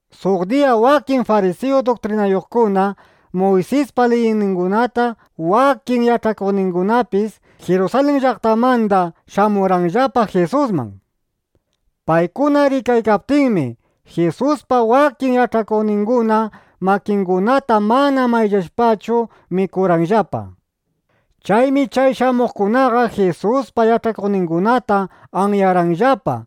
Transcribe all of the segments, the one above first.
Suq diyam wakin farisiyu duktrinayuqkuna, Muysispa liyningunata wakin yach'achikuqkunapis Jirusalin llaqtamanda shamurqanllapa Jisusman. Paykuna rikaykaptinmi, Jisuspa wakin yach'akuqninguna makingunata mana mayllashpachu mikurqanllapa. Chaymi chay shamuqkunaqa Jisuspa yach'akuqningunata anyarqanllapa.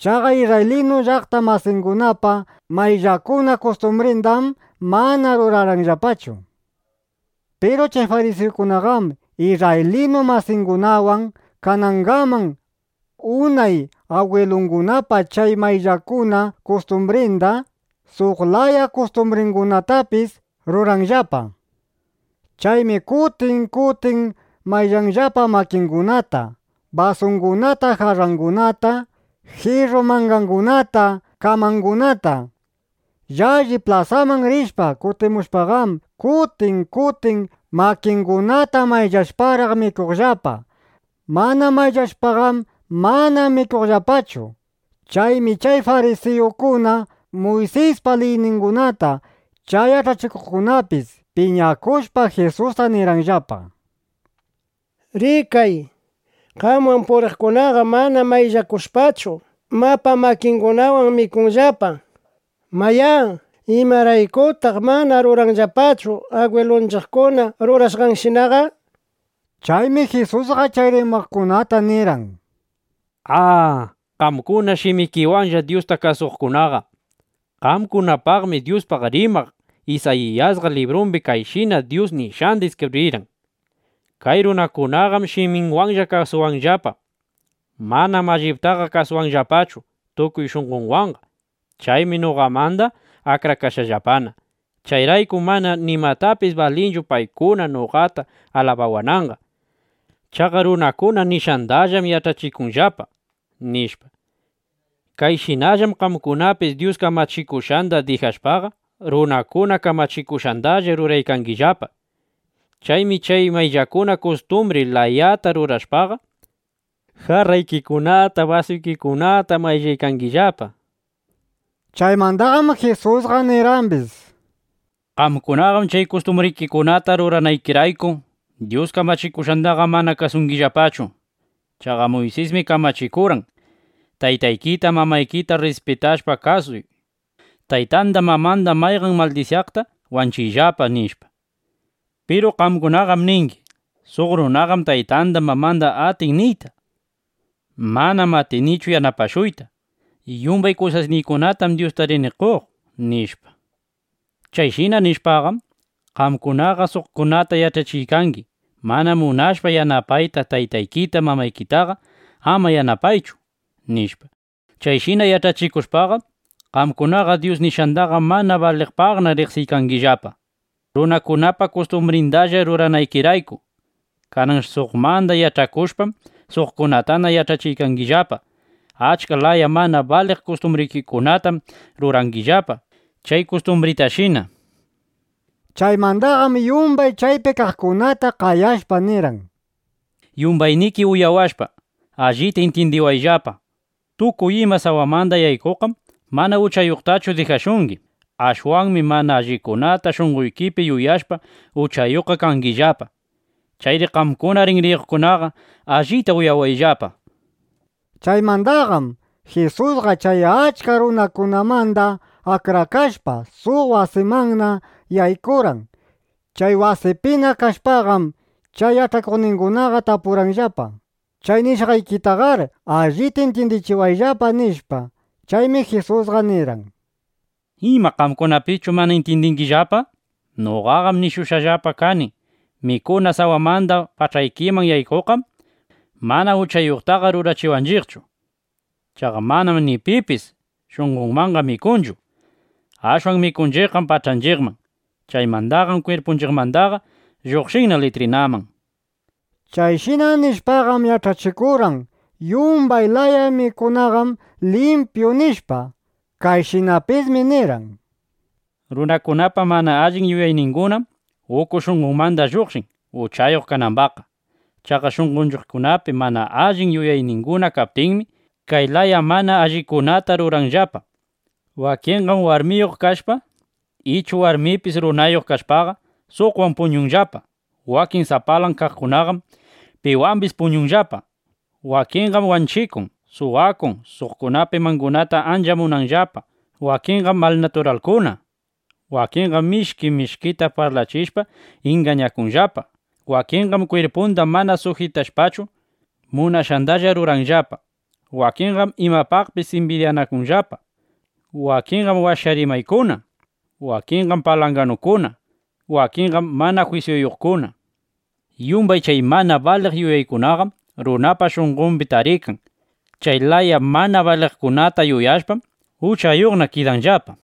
Chaqa isrraylinu llaqta masingunapa mayllakuna kustumbrindam mana rurarqanllapachu. Piru chay farisiyukunaqam, isrraylinu masingunawan kanangaman unay agwilungunapa chay mayllakuna kustumbrinda, suq laya kustumbringunatapis ruranllapa. Chaymi kutin kutin mayllanllapa makingunata, basungunata, jarrangunata, jirru mangangunata, kamangunata. Llalli plasaman rishpa kutimushpaqam, kutin kutin makingunata mayllashparaq mikunllapaqa. Mana mayllashpaqam, mana mikunllapachu. Chaymi chay farisiyukuna, Muysispa liyningunata chay yach'achikuqkunapis piñakushpa, Jisusta nirqanllapa: —Rikay, qamwan puriqkunaqam mana mayllakushpachu, mapa makingunawan mikunllapa. Mayá, ¿imaraykutaq mana ruranllapachu agwilunchiqkuna rurashqanshinaqa? nishpa. Chaymi Jisusqa chay rimaqkunata nirqan: —¡A, qamkuna shimikiwanlla Dyusta kasuqkunaqa! Qamkunapaqmi Dyuspaq rimaq Isayiyasqa librumbi kayshina Dyus nishqanda iskibrirqan: Kay runakunaqam shiminwanlla kasuwanllapa. Manam alliptaqa kasuwanllapachu tukuy shunqonwanqa. Chaymi noqamandaqa akrakashqallapana. Chayraykum mana nimapis balinchu paykuna noqata alabawananqa. Chaqa runakuna nishqandallam yach'achikunllapa, nishpa. Kayshinallam qamkunapis Dyus kamachikushqanda dijashpaqa, runakuna kamachikushqandalla ruraykangillapa. Chaymi chay mayllakuna kustumbri layata rurashpaqa, jarraykikunata, basuykikunata mayllangillapa. Chaymandaqam Jisusqa nirqambis: —Qamkunaqam chay kustumbrikikunata ruranaykirayku, Dyus kamachikushqandaqa mana kasungillapachu. Chaqa Muysismi kamachikurqan: “Taytaykita, mamaykita rrispitashpa kasuy. Taytanda mamanda mayqan maldisyaqta wanchiyllapa”, nishpa. Piru qamkunaqam ningi: “Suq runaqam taytanda mamanda atin niyta: ‘Manam atinichu yanapashuyta. Yumbay kusasniykunatam Dyusta rini qoq’” nishpa. Chayshina nishpaqam, qamkunaqa suqkunata yach'achiykangi: “Mana munashpa yanapayta taytaykita mamaykitaqa, ama yanapaychu”, nishpa. Chayshina yach'achikushpaqam, qamkunaqa Dyus nishqandaqa mana baliqpaqna riqsiykangillapa, runakunapa kustumbrindalla ruranaykirayku. Kanan suqmanda yach'akushpam, suqkunatana yach'achingillapa. Achka laya mana baliq kustumbrikunatam rurangillapa chay kustumbritashina. Chaymandaqam yumbay chaypi kaqkunata qayashpa nirqan: —Yumbayniki uyawashpa, allita intyindiwayllapa: Tukuy ima sawamanda yaykuqqam mana uchayuqtachu dijashungi. Ashwanmi mana allikunata shunqoykipi yuyashpa, uchayuqqa kangillapa. ˻Chayri qamkuna rinriyuqkunaqa allita uyawayllapa,˼ nishpa. Chaymandaqam Jisusqa chay achka runakunamanda akrakashpa, suq wasimanna yaykurqan. Chay wasipina kashpaqam, chay yach'akuqningunaqa tapurqanllapa: —Chay nishqaykitaqar allita intyindichiwayllapa, nishpa. Chaymi Jisusqa nirqan: —¿Ima qamkunapischu mana intyindingillapa? Noqaqam nishushqallapa kani: Mikuna sawamanda pach'anchiqman yaykushpaqam, mana uchayuqtaqa rurachiwanchiqchu. Chaqa manam ni pipis shunqonmanqa mikunchu. Ashwan mikunchiqqam pach'anchiqman. Chaymandaqam kwirpunchiqmandaqa lluqshinna litrinaman. Chayshina nishpaqam yach'achikurqan: Yumbay laya mikunaqam limpyu, nishpa. Kayshinapismi nirqan: —Runakunapa mana allin yuyayningunam uku shunqonmanda lluqshin, uchayuq kanambaqqa. Chaqa shunqonllapapi mana allin yuyayninguna kaptinmi, kay laya mana allikunata ruranllapa: Wakinqam warmiyuq kashpa, ichu warmipis runayuq kashpaqa, suqwan puñunllapa. Wakin sapalan kaqkunaqam piwambis puñunllapa. Wakinqam wanchikun, suwakun, suqpa imangunata ancha munanllapa. Wakinqam malnaturalkuna. Wakinqam mishki mishkita parlachishpa, ingañakunllapa. Wakinqam kwirpunda mana sujitashpachu, munashqandalla ruranllapa. Wakinqam imapaqpis imbidyakunllapa. Wakinqam washa rimaykuna. Wakinqam palanganukuna. Wakinqam mana jwisyuyuqkuna. Yumbay chay mana baliq yuyaykunaqam runapa shunqombi tarikan. Chay laya mana baliqkunata yuyashpam, uchayuqna kidanllapa.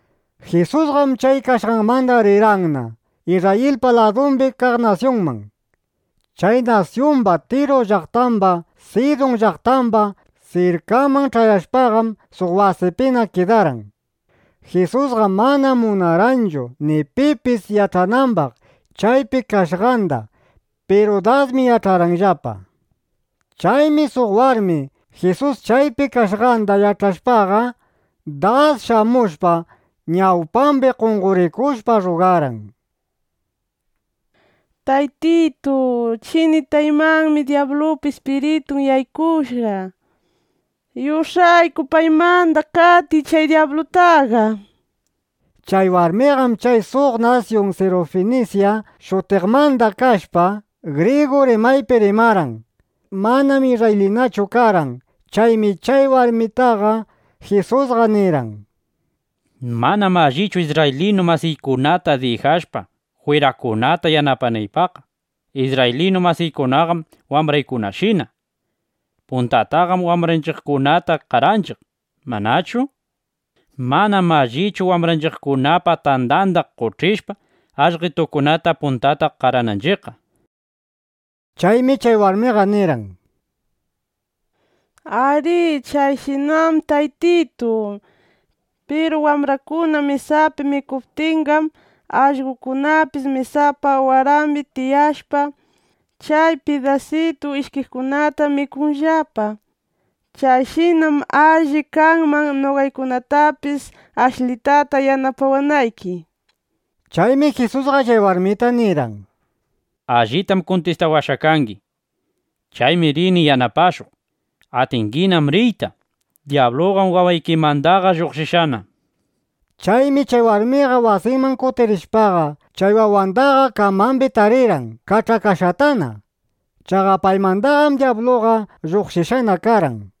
Jisusqam chay kashqanmandaqa rirqanna (Isrrayilpa ladumbi kaq nasyunman. Chay nasyumba) Tiru llaqtamba, Sidun llaqtamba sirkanman ch'ayashpaqam, suq wasipina kidarqan. Jisusqam mana munarqanchu ni pipis yach'anambaq chaypi kashqanda. Piru dasmi yach'arqanllapa. Chaymi suq warmi Jisus chaypi kashqanda yach'ashpaqa, das shamushpa, ñawpambi qonqorikushpa, rrugarqan: —Taytitu, chinitaymanmi dyablupa ispiritun yaykushqa. Yush'ayku paymanda qatiy chay dyablutaqa, nishpa. Chay warmiqam chay suq nasyun Sirufinisya shutiqmanda kashpa, grigu rimaypi rimarqan. Manam isrraylinachu karqan. Chaymi chay warmitaqa Jisusqa nirqan: —Manam allichu isrraylinu masiykunata dijashpa, jwirakunata yanapanaypaqqa. Isrraylinu masiykunaqam wambraykunashina. Puntataqam wambranchiqkunata qaranchiq, ¿manachu? Manam allichu wambranchiqkunapa tandanda qoch'ishpa, allqetukunata puntata qarananchiqqa. Chaymi chay warmiqa nirqan: —Arí. Chayshinam, Taytitu. Piru wambrakuna mesapi mikuptinqam, allqokunapis mesapa warambi tiyashpa, chay pidasitun ishkiqkunata mikunllapa. (Chayshinam alli kanman, noqaykunatapis ashlitata yanapawanayki,) nishpa. Chaymi Jisusqa chay warmita nirqan: —Allitam kuntistawashqa kangi. Chaymi rini yanapashuq. Atinginam riyta. Dyabluqam wawaykimandaqa lluqshishqana, nishpa. Chaymi chay warmiqa wasinman kutirishpaqa, chay wawandaqa kamambi tarirqan kach'akashqatana. Chaqa paymandaqam dyabluqa lluqshishqana karqan.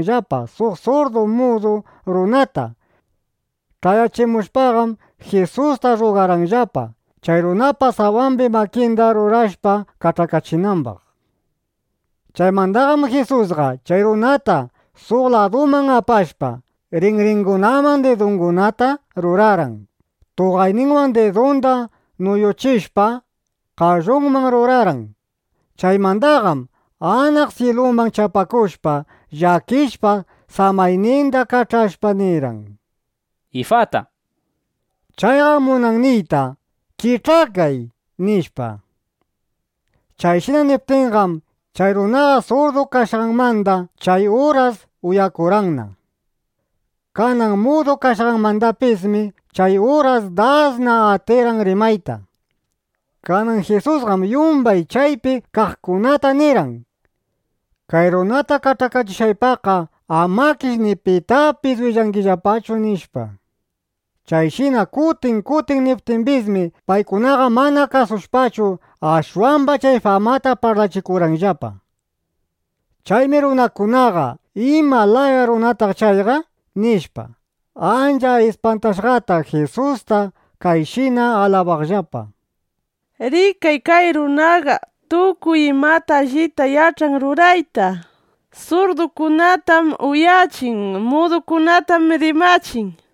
Chayman ch'ayaptinqam, Jisusman apamurqanllapa suq surdu mudu runata. Ch'ayachimushpaqam Jisusta rrugarqanllapa, chay runapa sawambi makinda rurashpa, kach'akachinambaq. Chaymandaqam Jisusqa chay runata suq laduman apashpa, rinringunaman didungunata rurarqan. Tuqayninwan didunda nuyuchishpa, qallunman rurarqan. Chaymandaqam anaq syiluman chapakushpa, llakishpa, samayninda kach'ashpa nirqan: —¡Ifata! Chayqam munan niyta: “¡Kich'akay!” nishpa. Chayshina niptinqam, chay runaqa surdu kashqanmanda chay uras uyakurqanqa. Kanan mudu kashqanmandapismi, chay uras dasna atirqan rimayta. Kanan Jisusqam yumbay chaypi kaqkunata nirqan: —Kay runata kach'akachishqaypaqqa amakish ni pitapis willangillapachu, nishpa. Chayshina kutin kutin niptimbismi, paykunaqa mana kasushpachu, ashwamba chay famata parlachikurqanllapa. Chaymi runakunaqa: ¿Ima laya runataq chayqa? nishpa, ancha ispantashqata Jisusta kayshina alabaqllapa: —¡Rikay kay runaqa! Tukuy imata allita yach'an rurayta. Surdukunatam uyachin. Mudukunatam rimachin, nishpa.